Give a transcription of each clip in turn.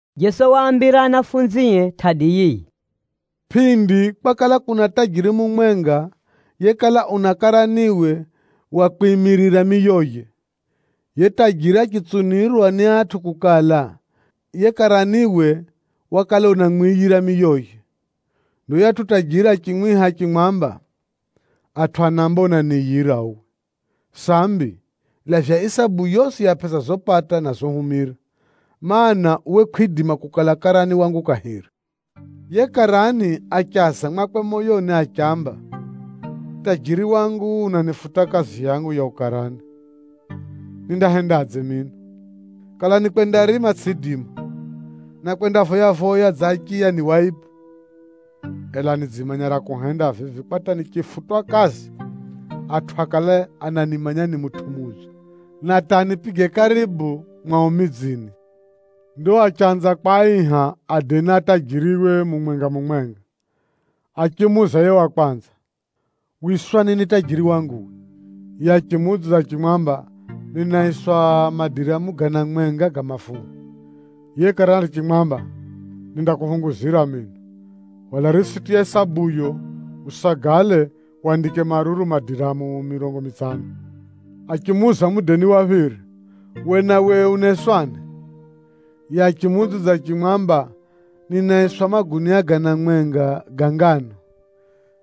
Jeso waambira anafunzie tʼadi yiyi: “Pʼindi kwakala kuna tajiri mumwenga yekala una karaniwe wa kwimirira miyoye. Yiye tajiri achitsunirwa ni atʼu kukala, yiye karaniwe wakala unamwiyira miyoye. Ndo yuyatʼu tajiri achimwiha achimwamba, ‘Atʼu anaamba unaniiyira uwe! Sambi, lavya isabu yosi ya pʼesa zopata na zohumira, mana, uwe kʼwidima kukala karani wangu kahiri.’ Yiye karani achaza mwakwe moyoni achiamba, ‘Tajiri wangu unanifuta kazi yangu ya ukarani, nindahendadze mino? Kala ni kwendarima tsʼiidima, na kwendavoya-voya dza achiya ni waibu. Ela nidzimanya ra kuhenda vivi kwa hata nichifutwa kazi, atʼu akale ananimanya ni mutʼu mudzo, na hata anipige karibu mwao midzini.’ Ndo achanza kwaiha adeni a tajiriwe mumwenga-mumwenga. Achimuuza yiye wa kwanza, ‘Wiswani ni tajiri wangu we?’ Yiye achimuudzidza achimwamba, ‘Ninaiswa madiramu gana mwenga ga mafuha.’ Yiye karani achimwamba, ‘Nindakuphunguzira mino, hwala risiti ya isabuyo usagale wandike maruru madiramu mirongo mitsano.’ Achimuuza mudeni wa phiri, ‘We nawe unaiswani?’ Yiye achimuudzidza achimwamba, ‘Ninaiswa magunia gana mwenga ga nganu.’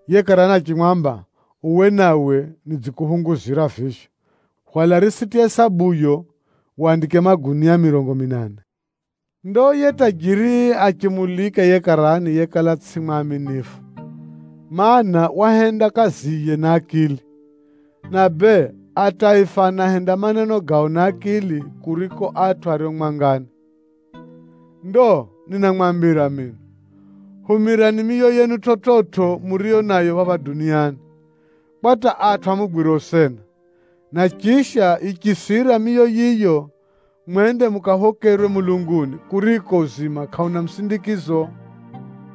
Yiye karani achimwamba, ‘Uwe nawe nidzikuphunguzira vivyo, hwala risiti ya isabuyo wandike magunia mirongo minane.’ “Ndo yiye tajiri achimulika yiye karani yekala tsʼi mwaminifu, mana, wahenda kaziye na akili. Na bee, ataifa anahenda maneno gao na akili kuriko atʼu ario mwangani. “Ndo ninamwambira mino, humirani miyo yenu chividzo muriyo nayo phapha duniani, kwa hata atʼu amugwire usena, na chisha yichisira miyo yiyo, mwende mukaphokerwe mulunguni, kuriko uzima kʼauna musindikizo.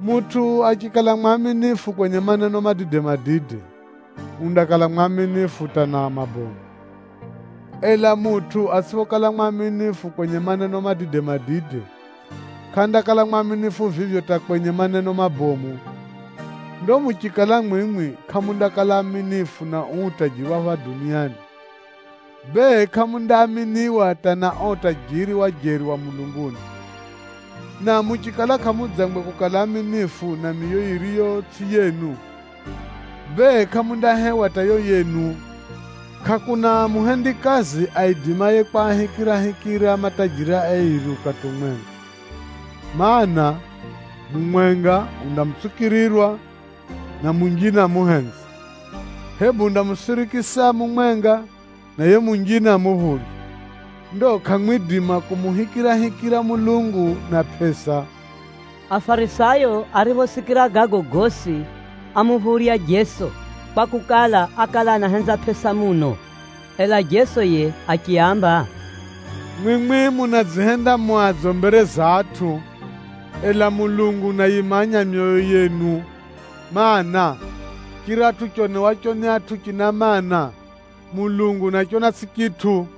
Mutʼu achikala mwaminifu kwenye maneno madide-madide, undakala mwaminifu hata na mabomu, ela mutʼu atsʼiphokala mwaminifu kwenye maneno madide-madide, kʼandakala mwaminifu vivyo hata kwenye maneno mabomu. Ndo muchikala mwimwi kʼamundakala aaminifu na uu utajiri wa phapha duniani, bee kʼamundaaminiwa hata na o utajiri wa jeri wa mulunguni. Na muchikala kʼamudzangwe kukala aaminifu na miyo yiriyo tsʼi yenu, bee kʼamundahewa hata yo yenu. “Kʼakuna muhendikazi aidimaye kwahikirahikira matajiri airi ukati umwenga. Maana, mumwenga undamutsukirirwa na munjine amuhenze, hebu undamusirikisa mumwenga, na yiye munjine amuphurye. Ndo kʼamwidima kumuhikirahikira Mulungu na pʼesa.” Afarisayo ariphosikira gago gosi, ámuphurya Jeso, kwakukala, ákala anahenza pʼesa muno. Ela Jeso yiye achiaamba, “Mwimwi munadzihenda mu adzo mbere za atʼu, ela Mulungu unayimanya myoyo yenu. Maana, chiratʼu chionewacho ni atʼu china mana, kwa Mulungu ni tsukizo.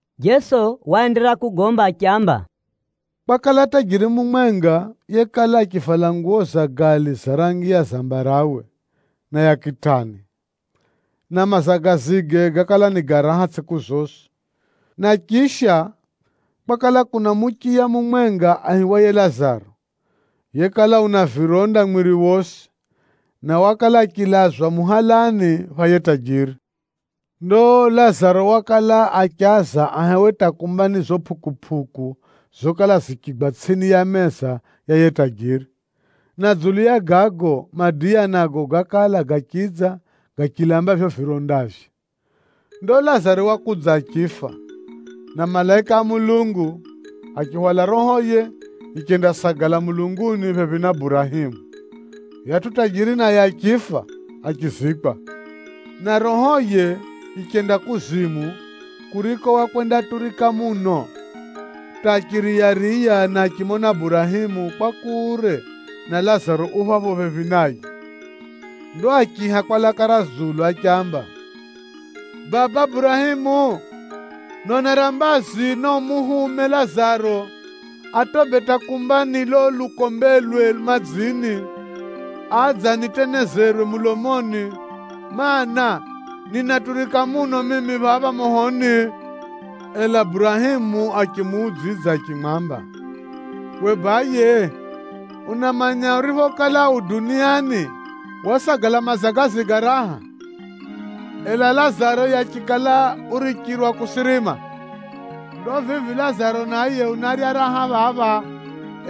Jeso waenderera kugomba achiamba, “Kwakala tajiri mumwenga yekala achivala nguwo za gali za rangi ya zambarawe na ya kitani, na mazagazige gákala ni ga raha tsʼiku zosi. Na chisha, kwakala kuna muchiya mumwenga aihiwaye Lazaro, yekala una vironda mwiri wosi, na wakala achilazwa muhalani pha yiye tajiri. Ndo Lazaro wakala achaza ahewe hata kumba ni zo pʼukupʼuku zokala zichigwa tsʼini ya meza ya yiye tajiri, na dzulu ya gago, madiya nago gákala gachidza gachilamba vivyo virondavye! “Ndo Lazaro wakudza achifa, na malaika a Mulungu achihwala rohoye yichendasagala mulunguni phephi na Burahemu. Chiyunani chinaamba: chilagani pha Burahemu. Yuyatʼu tajiri naye achifa, achizikwa, na rohoye yichenda kuzimu kuriko wakwendaturika muno, hata achiriyariya na achimona Burahemu kwa kure na Lazaro u phapho phephi naye. Ndo achiiha kwa laka ra dzulu achiamba, ‘Baba Burahemu, nonera mbazi, na muhume Lazaro atobe hata kumba ni lo lukombelwe madzini, adze anitenezerwe mulomoni, mana, ninaturika muno mimi phapha mohoni.’ Ela Burahemu achimuudzidza achimwamba, ‘We baye unamanya uriphokala u duniani, wasagala mazagazi ga raha, ela Lazaro yiye achikala urichirwa kusirima. Ndo vivi Lazaro naye unarya raha phapha,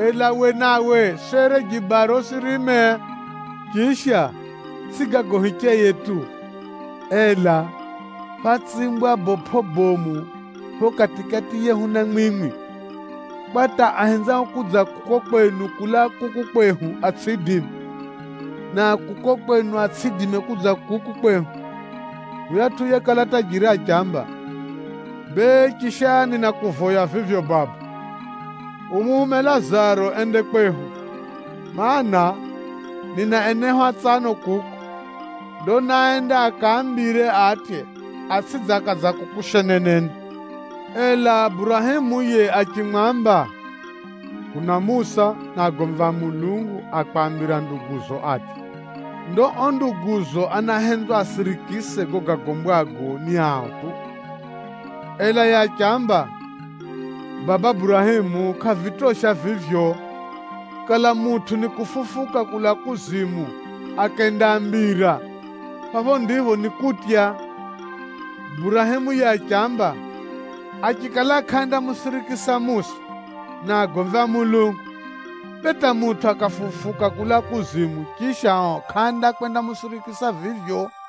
ela we nawe sere jibaro usirime. Chisha, tsʼi gago hicheye tu, ela phátsimbwa bopʼo bomu pho kati-kati yehu na mwimwi, kwa hata ahenzao kudza kuko kwenu kulaa kuku kwehu atsʼiidime, na a kuko kwenu atsʼiidime kudza kuku kwehu.’ Yuyatʼu yekala tajiri achiamba, ‘Bee chisha ninakuvoya vivyo Baba, umuhume Lazaro ende kwehu, mana, nina enehu atsano kuko. Ndo naaende akaambire atye, atsʼidze akadza kuku sheneneni.’ Ela Burahemu yiye achimwamba, ‘Kuna Musa na agomvi a Mulungu a kwaambira nduguzo atye. Ndo o nduguzo anahenzwa asirikise gago gagombwago ni ao tu.’ Ela yiye achiamba, ‘Baba Burahemu kʼavitosha vivyo! Kala mutʼu ni kufufuka kulaa kuzimu akendaambira, phapho ndipho nikutya.’ Burahemu yiye achiamba, ‘Achikala kʼaandamusikira Musa na agomvi a Mulungu, bee hata mutʼu akafufuka kulaa kuzimu, chisha o kʼaandakwendamusikira vivyo.’”